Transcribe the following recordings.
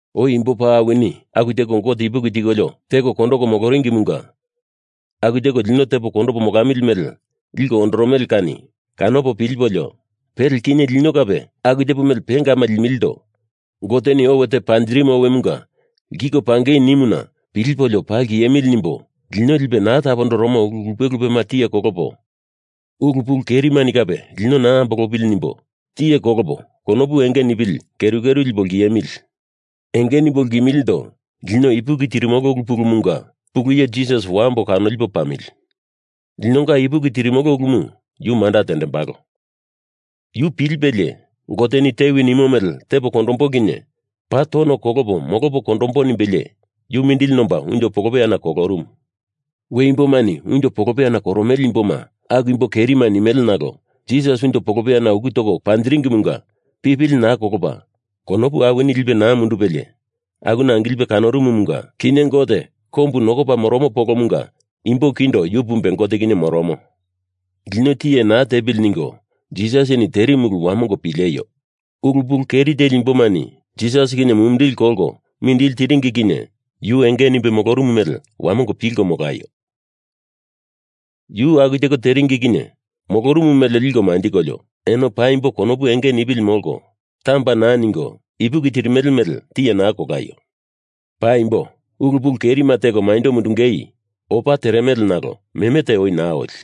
Oi imbo paa awini aku teko Gote ipuki tikolio teko kondoko moloringimunga aku tepo lino tepo kondamili mele liko ondoromele kani kanopo pilipolio pele kinye lino kape aku tepo mele pengama limilindo Goteni owe te panjirimu owemunga lkiko pangei nimuna pilipolio paa lkiemili nimbo lino lipe naa tapondoromo ulu lupe lupema tiye kolopo, ulu pulu kerimani kape lino naa ambolopili nimbo tiye kolopo konopu enge nipili keru keru lipo lkiemili. Enge nimbo lkimilindo lino ipuki tirimolo ulu pulumunga pulu iye Jisas wambo kanolipo pamili. Linonga ipuki tirimolo ulumu yu manda tendembalo. Yu pilipelie, Goteni tewi nimo mele tepo kondombo kinye paa tono kolopo molopo kondombo nimbelie yu mindili nomba unjo polopeyana kolorumu. We imbomani unjo polopeyana koromele imboma aku imbo kerima nimele nalo Jisas unjo polopeyana uku toko panjingeimunga pipili naa kolopa konopu awini lipe naa mundupelie akuna angilipe kolorumumunga kinye Gote kombu nokopa moromo polomunga imbo kindo yu pumbe Gote kinye moromo. Lino tiye naa tepili ningo Jisasini terimu ulu wamongo pileio. Ulu pulu keri teli imbomani Jisas kinye mumindili kolko mindili tiringi kinye yu enge nimbe molorumu mele wamongo pilko molaio. Yu aku teko teringi kinye molorumu mele liko manjikolio eno paimbo konopu enge nipili molko, tamba naa ningo ipuki tirimele mele tiye naa kolaio. Paimbo, ulu pulu kerima teko maindo mundungei opa teremele nalo meme te oi naa oli.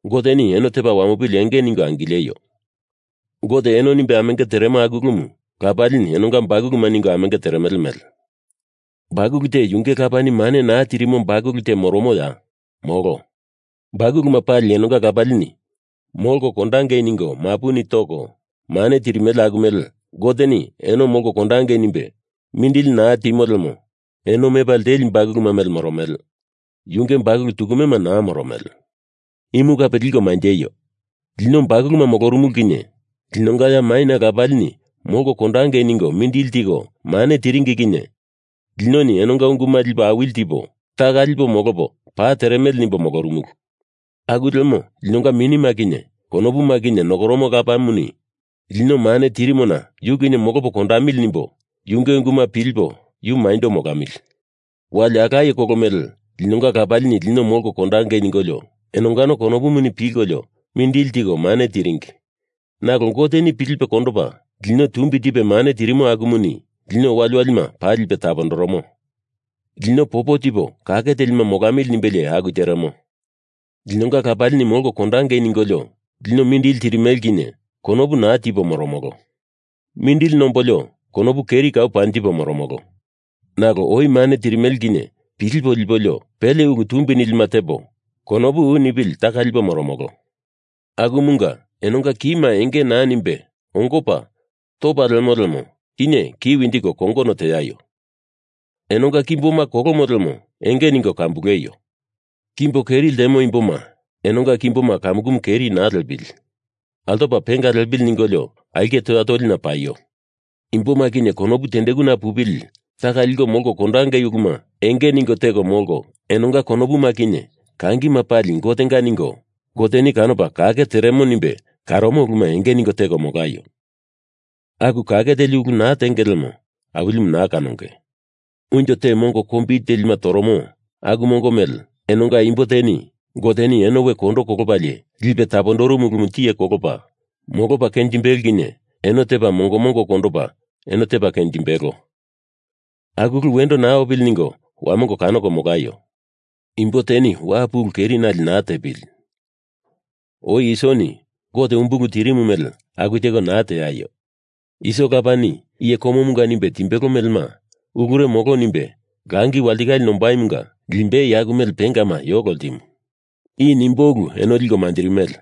Goteni eno tepa wamopili enge ningo angileio. Gote eno nimbe amenge teremo aku ulumu Lapalini enonga bakuluma ningo amenge teremele mele. Bakulu te yunge lapani mane naa tirimo bakulu te moromoya? Molo. Bakuluma pali enonga lapalini molko kondangei ningo mapuni toko mane tirimele aku mele Goteni eno molko kondangei nimbe mindili naa timo lemo eno mepa lteli bakuluma mele moromele, yunge bakulu tukumema naa moromele. Imu kape liko manjeio! Lino bakuluma molorumulu kinye linonga ya maina lapalini molko kondangei ningo mindili tiko mane tiringi kinye linoni enonga unguma lipo awili tipo taka lipo molopo paa teremele nimbo molorumulu. Aku lemo linonga minima kinye konopuma kinye nokoromo Lapamuni lino mane tirimona yu kinye molopo kondamili nimbo yunge unguma pilipo yu maindo molamili. Wali alaye kolo mele linonga lapalini lino molko kondangei ningolio enongano konopuni pilkolio mindili tiko mane tiringi, nalo Goteni pilipe kondopa lino tumbi tipe mane tirimo akumuni lino waliwalima paa lipe tapondoromo. Lino popo tipo kake telima molamili nimbelie aku teremo. Linonga lapalini molko kondangei ningolio lino mindili tirimele kinye konopu naa tipo moromolo. Mindili nombolio konopu keri kau panjipo moromolo. Nalo oi mane tirimele kinye pilipo lipolio pele ulu tumbi nilima tepo konopu u nipili taka lipo moromolo. Akumunga, enonga kima enge naa nimbe ongopa topa lemo lemo, kinye ki winjiko kongono teaio. Enonga kimboma kolomo lemo enge ningo kambuleio. Kimbo keri ltemo imboma enonga kimboma kamukumu keri naa liepili. Altopa penga liepili ningolio aulke toya tolina paio. Imboma kinye konopu tendekuna pupili taka liko molko kondongei uluma enge ningo teko molko, enonga konopuma kinye kangima pali Gotenga ningo Goteni kanopa kake teremo nimbe kanoromo uluma enge ningo teko molaio. Aku kake teli ulu naa tenge lemo Awilimu naa kanonge. Unjo te mongo kombili telima toromo aku mongo mele enonga imbo teni Goteni eno we kondo kolopalie lipe tapondorumu ulumu tiye kolopa molopa kenjimbelo kinye eno tepa mongo mongo kondopa eno tepa kenjimbelo. Aku ulu wendo naa opili ningo wamongo kanoko molaio. Imbo teni wapu ulu kerinali naa tepili. Oi Isoni Gote umbulu tirimu mele aku teko naa teaio. Iso lapani iye komomunga nimbe timbelo melema ulure molo nimbe langi walitikale nombaimunga limbei aku mele pengama yolo ltimu. I nimboi ulu eno liko manjirimele.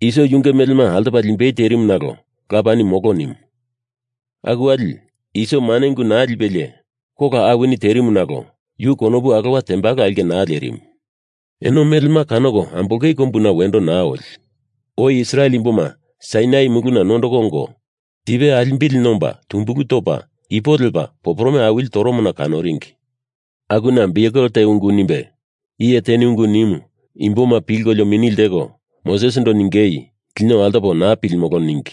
Iso yunge melema altopa limbei terimu nalo lapani molo nimu. Aku wali Iso mane ungu naa lipelie kola awini terimu nalo yu konopu alowa tembalo aulke naa lerimu. Eno melema kanoko ambolongei kombuna wendo naa oli. Oi Israel imboma Sainai Muluna nondoko ongo tipe alimbili nomba tumbulu topa ipo lepa poporome awili toromona kanoringi. Akuna biukel te ungu nimbe iye teni ungu nimu imboma pilkolio mini lteko Mosesindo ningei lino altopo naa pilimolo ningi.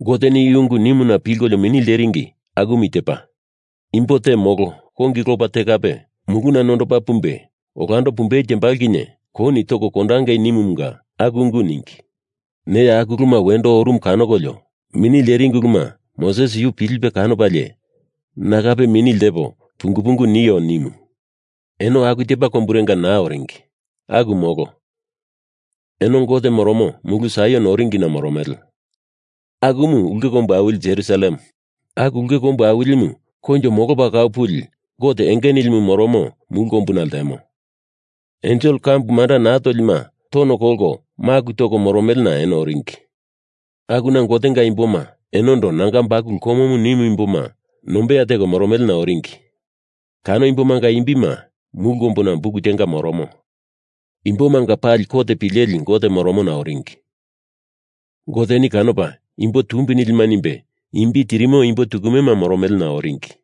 Goteni i ungu nimuna pilkolio mini lteringi akumu i tepa: Imbo te molo kongi lopa te kape muluna nondopa pumbe olando pumbei tembalo kinye kouni toko kondangei nimumunga aku ungu ningi. Neya aku uluma wendo orumu kanokolio mini lteringi uluma Moses yu pilipe kanopalie na kape mini ltepo pungu pungu nio, nimu. Eno aku tepa komburenga naa oringi. Aku molo. Eno Gote moromo mulu Saion oringina moromele. Akumu ulke kombu awili Jerusalem. Aku ulke kombu awilimu koinjo molopa kau puli Gote enge nilimu moromo mulu kombuna ltemo. Ensel kambu manda naa tolima tono kolko maku toko moromelena eno oringi. Akuna Gotenga imboma, enondo nanga bakulu komomu nimu imboma nombeya teko moromelena oringi. Kano imbomanga imbima mulu kombuna buk tenga moromo. Imbomanga pali kot pileli Gote moromona oringi. Goteni kanopa imbo tumbi nilima nimbe imbi tirimo imbo tukumema moromelena oringi.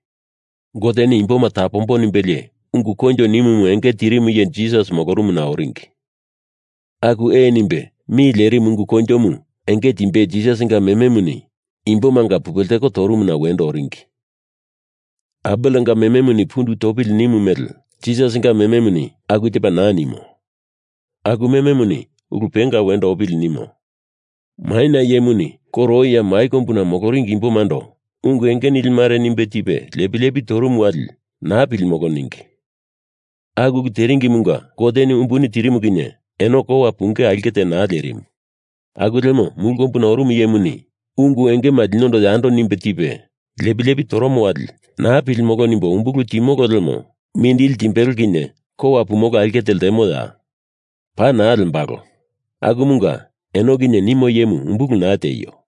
Goteni imboma tapombo nimbelie ungu koinjo nimumu enge tirimu iye Jisas moromona oringi. Aku ee nimbe mi lerimu ungu koinjomu enge timbei Jisasinga mememuni imbomanga pupe lteko torumuna wendo oringi. Abelenga mememuni pundu topili nimu mele Jisasinga mememuni aku tepa naa nimo. Aku mememuni ulu penga wendo opili nimo. Maina iyemuni koro oi ya mai kombuna moloringi imbomando ungu enge nili mare nimbe tipe lepi lepi torumu wali naa pilimolo ningi. Aku ulu teringimunga Goteni umbuni tirimu kinye eno kowa pungei aulke te naa lerimu. Aku lemo mulu kombuna orumu iyemuni ungu engema linondo yando nimbe tipe lepi lepi toromo wali naa pilimolo nimbo umbulu timolo lemo mindili timbelo kinye kowa pumolo aulke te lembaloya? Paa naa lembalo. Akumunga eno kinye nimo iyemu umbulu naa tieio.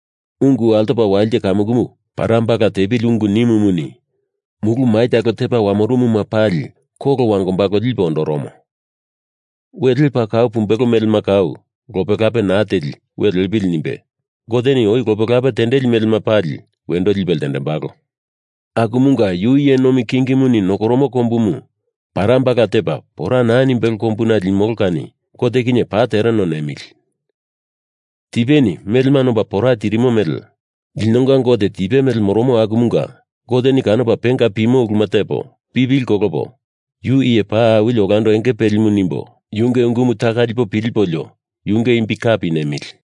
Ungu altopo walite kamukumu parambala tepili ungu nimumuni mulu mai talo tepa wamorumuma pali kolo wangombalo lipe ondoromo. We lepa kau pumbelo melema kau lope lape naa teli we lepili nimbe Goteni oi lope lape tendeli melema pali wendo lipe ltendembalo. Akumunga Yu iye nomi kingimuni nokoromo kombumu parambala tepa pora naa nimbelo kombuna limolo kani Gote kinye paa tereno nemili. Tipeni melema nomba pora tirimo mele linonga Gote tipe mele moromo akumunga Goteni kanopa penga pimo uluma tepo pipili kolopo Yu iye paa awili olando enge pelimu nimbo yunge ungumu taka lipo pilipolio yunge imbi kape nemili.